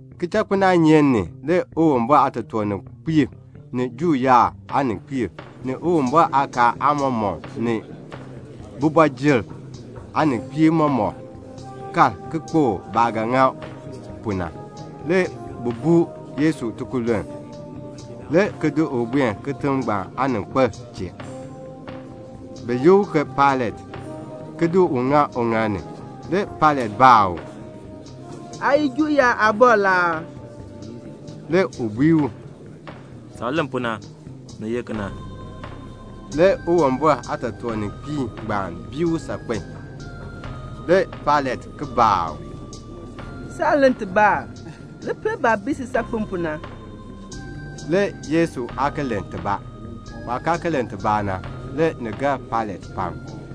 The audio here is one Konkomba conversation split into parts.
Kichakpinaanyeek ni le Uwumbɔr aatotoorninkpiib, ni Juu yaab aaninkpiib, ni Uwumbɔr aakaal aamɔmɔkb, ni kooti ni aaninkpiib mɔmɔk, kal kpokl baah ga ŋa pu na. Le bi buu Yesu tikululn, le ki di u buen kitiŋ ngbaan aaninkpil chee, bi yi u ke Pailat, ki di u ŋa uŋaal ni. Le Pailat baa u, "Aa ye Juu yaab aabɔr la aa?" Le u bui u, "Saah len pu na, ni ye kena." Le Uwumbɔr aatotoorninkpiib ngbaan bii u saakpen a. Le Pailat ki baa u, "Saan len tibaa aa? Li pel baah bii si saakpen pu na." Le Yesu aa ki len tibaa. Waah kaa len tibaa na, le ni gar Pailat pam.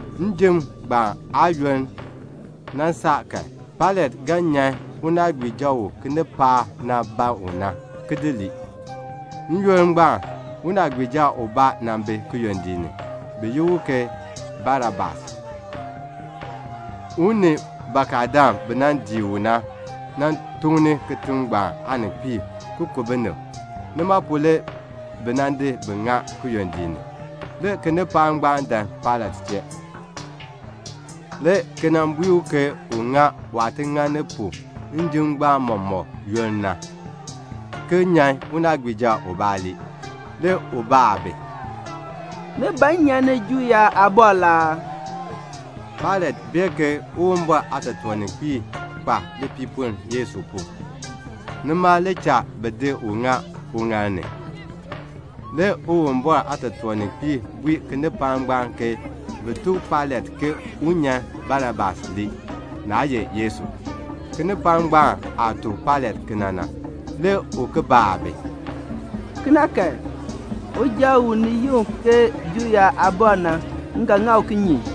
Njim ngbaan aayoonn nan saa kan, Pailat ga nyan unaagbiija u kinipaak na ban u na ki lii. N-yoonn ngbaan le unaagbiija bi kiyondiik ni, bi yi u ke Barabas. U ni bakadam bi nan dii u na nan tukni kitiŋ ngbaan aaninkpiib, ki ku binib. Nima pu na le bi nan di bi ŋa kiyondiik ni. Le kinipaak ngbaan dan Pailat chee, le ki bui u ke un ŋa waah ti ŋani pu njim ngbaan mɔmɔk yoonn na, ki nyan unaagbiija ubaa ki lii. Le u baa bi, "Ni ban m nyan ni Juu yaab aabɔr la aa?" Pailat bee ke Uwumbɔr aatotoorninkpiib kpa lipiipoln Yesu pu, nima le cha bi di u ki di ŋa uŋaal ni. Le Uwumbɔr aatotoorninkpiib bui kinipaak ngbaan ke bin tuk Pailat ke un nyan Barabas lii, naa ye Yesu. Kinipaak ngbaan aah tuk Pailat kena na, le u ki baa bi, "Kena kan, uja ngbaan u ni yi u ke Juu yaab aabɔr na, m ga ŋa u kinye?"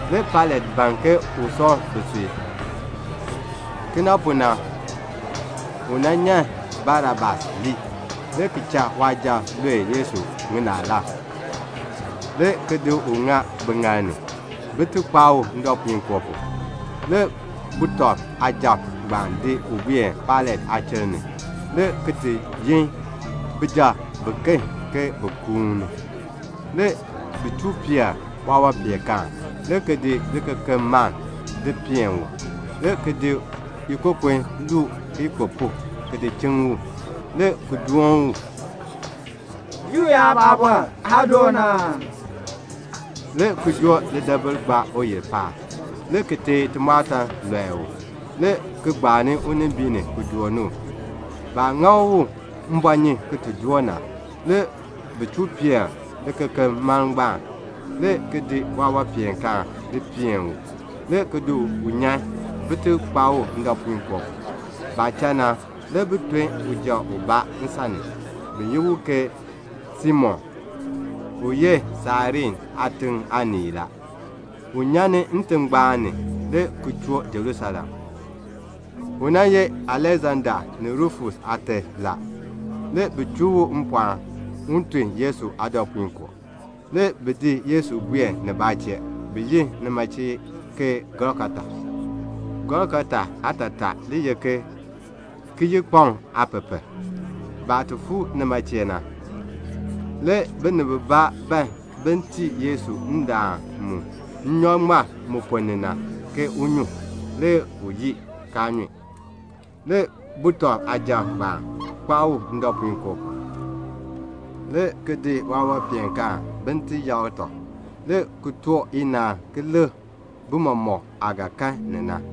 Le Pailat ban ke un sɔŋ bisui. Kena pu na, le u nyan Barabas lii, le ki cha waasujatiib lue Yesu ŋinaalab, le ki di u ŋa biŋaal ni, bin ti kpaa u ndɔpuinkoo pu. Le sujatiib ngbaan di u buen Pailat aachiln ni, le ki yin sujatiib biken, ke bin kuuni. Le bi chuu peer waawanpeenkaan, le ki di libɔkumaln ki di peen u, le ki di ikokon ki luu kiyikpupuk le ki di chiŋ u, le ki doon u, "Juu yaab aabɔr, aa doon aa?" le ki di lidaabil joo gbaa uyil paab, le ki teei timɔɔtan ki lɔe u, li ki gbaan unimbiin ni ki doon u. Baah ŋa u mbɔɔnyun ki ti doo na, le bi chuu peer libɔkumaln ngbaan, le ki di waawanpeenkaan di peen u, le ki di u nyan, bin ti kpaa u ndɔpuinkoo pu. Baah cha na, le bi ton uja ubaa nsan ni, bi yi u ke Simon, u ye Sairene aatiŋ aanii. U nyan ni ntingbaan ni la, le ki choo Jerusalem. U ye Aleksanda ni Rufus aate la. Le bi chuu u mpɔɔn, un tun Yesu aadɔpuinkoo. Le bi di Yesu ki di buen nibaa chee, bi yi nima chee ke Golgota. Golgota aatataa le ye ke "Kiyikpaŋ aapepel." Baah fuu nima chee na, le binib bibaa ban bin tii Yesu nnyɔk mu ŋmar ndaan ponn ni na ke un nyun. Le u yii, kaa nyun. Le sujatiib ngbaan kpaa u ndɔpuinkoo pu. Le bi di waawanpeenkaan bin ti yakr tɔb, le ki too chacha ke bi lik bimɔk aah ga kan ni na.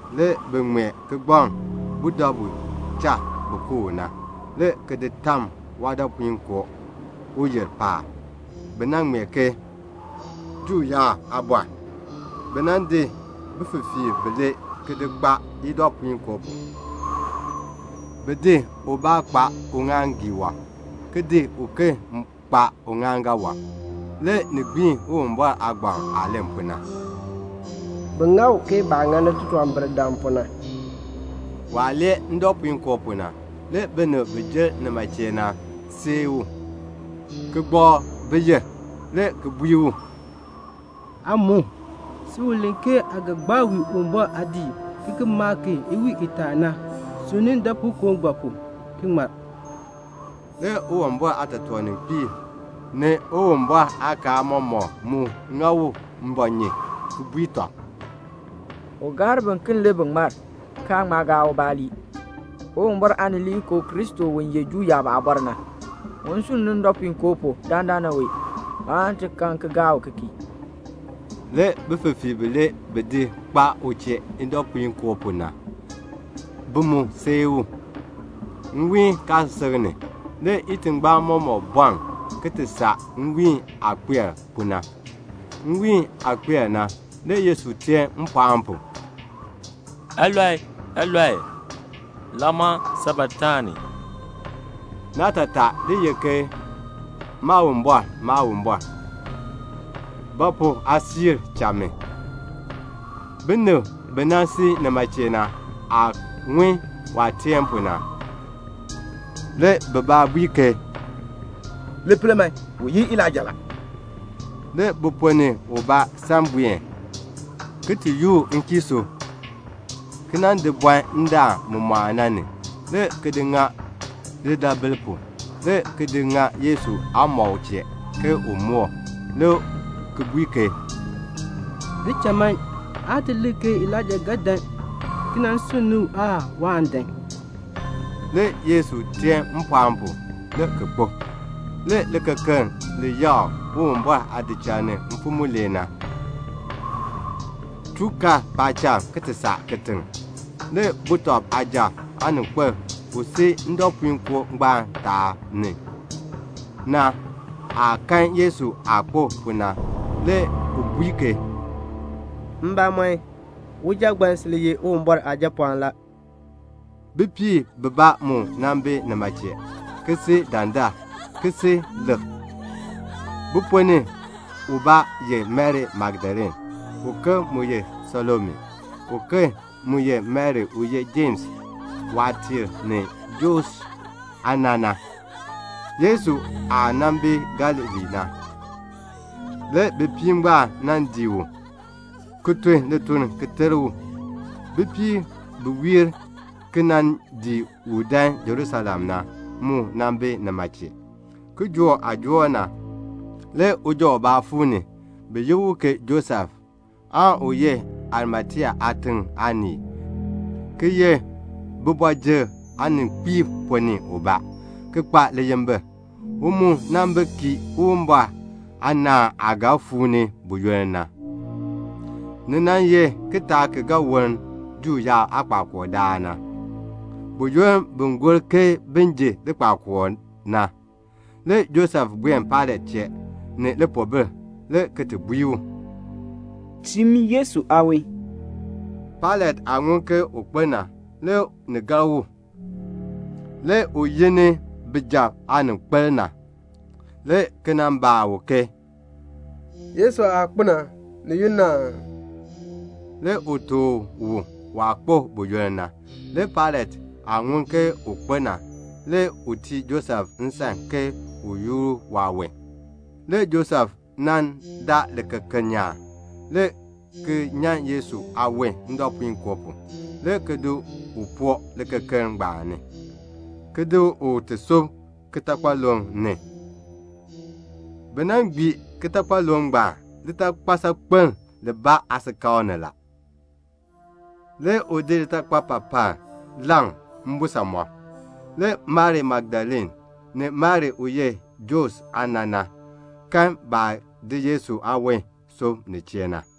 Le bi di kigbaŋ, ki ŋmee budabu cha bi ku u na, le ki di tam waadɔpuinkoo pu uyil paab. Bi ŋmee ke "Juu yaab aabɔr." Le bi di bififiirb bilee, ki di kpaa idɔpuinkoo pu. Bi di ubaa kpaa uŋaaŋgii wɔb, ki di uken kpaa uŋaaŋgan wɔb. [ Le ni gbiin Uwumbɔr aagbaŋ aah len pu na, "Bi ŋa u ke baah ŋani titunwambirdam pu na."] Waah lee ndɔpuinkoo pu na, le binib bi jer nima chee na sii u, ki gbakr biyil, le ki bui u, "Aa mu. Si u len ke aa ga gbaa wii Uwumbɔr aadiik ki ki maa ki iwiin itaa na, sunni ndɔpuinkoo ngbaan pu ki ŋmar." Le Uwumbɔr aatotoorninkpiib, ni Uwumbɔr aakaal aamɔmɔkb mu ŋa u mbɔɔnyun, ki bui tɔb, "U gaar biken le bi ŋmar, kaan ŋma gaa ubaa ki ŋmar. Uwumbɔr Aanileekoo Kristo u ye Juu yaab aabɔr na, un sunn ni ndɔpuinkoo pu dandana wee, aan ti kan ki gaa u ki kii." Le bififiirb bilee, bi bi di kpaa u chee idɔpuinkoo pu na, bi mu sii u la. Nwiin kaasisik ni, le itingbaan mɔmɔk bɔln, ki ti saa nwiin aah kpar pu na. Nwiin aah kpar na, le Yesu teen mpɔɔn pu, "Eloi, eloi, lama sabaktani." Naatataa le ye ke "Maawumbɔr, Maawumbɔr, ba pu aa di cha mi?" Binib bi si nima chee na aah ŋun waah teen pu na, le bibaa bui ke, "Li pel man, u yi Elaija la." Le bi ponn ni ubaa san buen ki ti yoor nkiisuu, ki nan di bɔn ndaan mu mɔɔn na ni, le ki di ŋa lidaabil pu, le ki di ŋa Yesu aamɔb chee, ke un moor, le ki bui ke, "Di cha man, ti lik ke Elaija ga dan ki nan sunn ni u aan waan dan." Le Yesu ki teen mpɔɔn pu, le ki kpo. Le likekeln li yakr Uwumbɔr aadiik ni mfim mulee na, chuu kar paacham ki ti saa kitiŋ. Le sujatiib aaninkpil u si ndɔpuinkoo ngbaan aanimbiin ni na, waah kan Yesu aah kpo pu na, le u bui ke, "Mbamɔn, uja ngbaan sil ye Uwumbɔr Aajapɔɔn la." Bipiib bibaa mu nan bi nima chee, ki si dandar, ki si lik. Bi ponn ni ubaa ye Mari Magdalene, uken mu ye Salome, uken mu ye Mari u ye Jems waatiir ni Joses aana na. Yesu aah nan bi Galilee na, le bipiib ngbaan nan dii u, ki tun lituln ki ter u. Bipiib bi wiir ki nan dii u dan Jerusalem na, mu nan bi nima chee. Kijook aah joor na, le uja ubaa fuu ni, bi yi u ke Josef u ye Arimatea aatiŋ aanii, ki ye kooti ni aaninkpiib ponn ni ubaa la, ki kpa liyimbil. U mu nan bi kii Uwumbɔr aanaan aah ga fuu ni buyoonn na. Ni nan ye kitaak ki ga woln Juu yaab aakpakool daal na, buyoonn bi gor ke bin ji likpakool na. Le Josef buen Pailat chee ni lipoobil, ki bui u, "Tiin mi Yesu aawon." Pailat aah ŋun ke u kpo na, le ni gar u. Le u yi ni sujatiib aaninkpil, le ki nan baa u ke "Yesu aah kpo na, ni yunn aa?" Le u tuk u waah kpo buyoonn na. Le Pailat aah ŋun ke u kpo na, le u tii Josef nsan ke un yoor waawon. Le Josef nan daa likekeln nyaan, le ki nyan Yesu aawon ndɔpuinkoo pu, le ki di u ki di poo likekeln ngbaan ni, ki di u ki ti di sub kitakpaluŋ ni. Bi nan gbii kitakpaluŋ ngbaan litakpal saakpeln aasikakl ni. Le u di litakpapapal ki di leŋ mbisamɔb. Le Mari Magdalene, ni Mari u ye Joses aana na, kan baah di Yesu aawon ki di sub nin chee na.